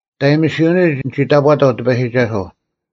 ᓂᑦ ᐊᔨᒥᓯᐅᓂᒡ ᓂᒋ ᑕᑈᑕᐤ ᑎᐸᔨᒋᒐᓱᐤ,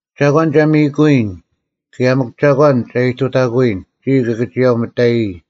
ᒐᒂᓐ ᒐ ᒥᔨᑯᐎᔨᓐ? ᑭᔭ ᒥᒄ ᒐᒂᓐ ᒐ ᐃᑐᑕᑯᐎᔨᓐ, ᒋᔾ ᑭᑭᒋᔭᐤ ᒥᑕᔨᔾ?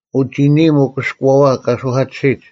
ᐅ ᒋᓂᐃᒻ ᐊᑭᔅᑯᐛᐛ ᑲ ᓱᐧᑲᑎᓯᒡ,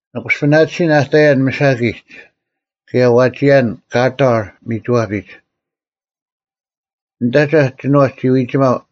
ᓂ ᑯᔅᐱᓇᑎᓯᓐ ᐊ ᑕᔭᓐ ᒥᓴᑭᒡ, ᐊ ᐎᒋᔭᓐ ᑲᑕᕐ ᒥᒋᐛᐱᒡ! ᓂᑦ ᐊᒐᐧᒄ ᒋᓏᔅ ᒋ ᐎᒋᒪᐤ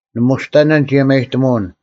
ᓂ ᒧᔅᑕᓇᓐ ᒋᔭᒪᔨᑎᒧᐅᓐ: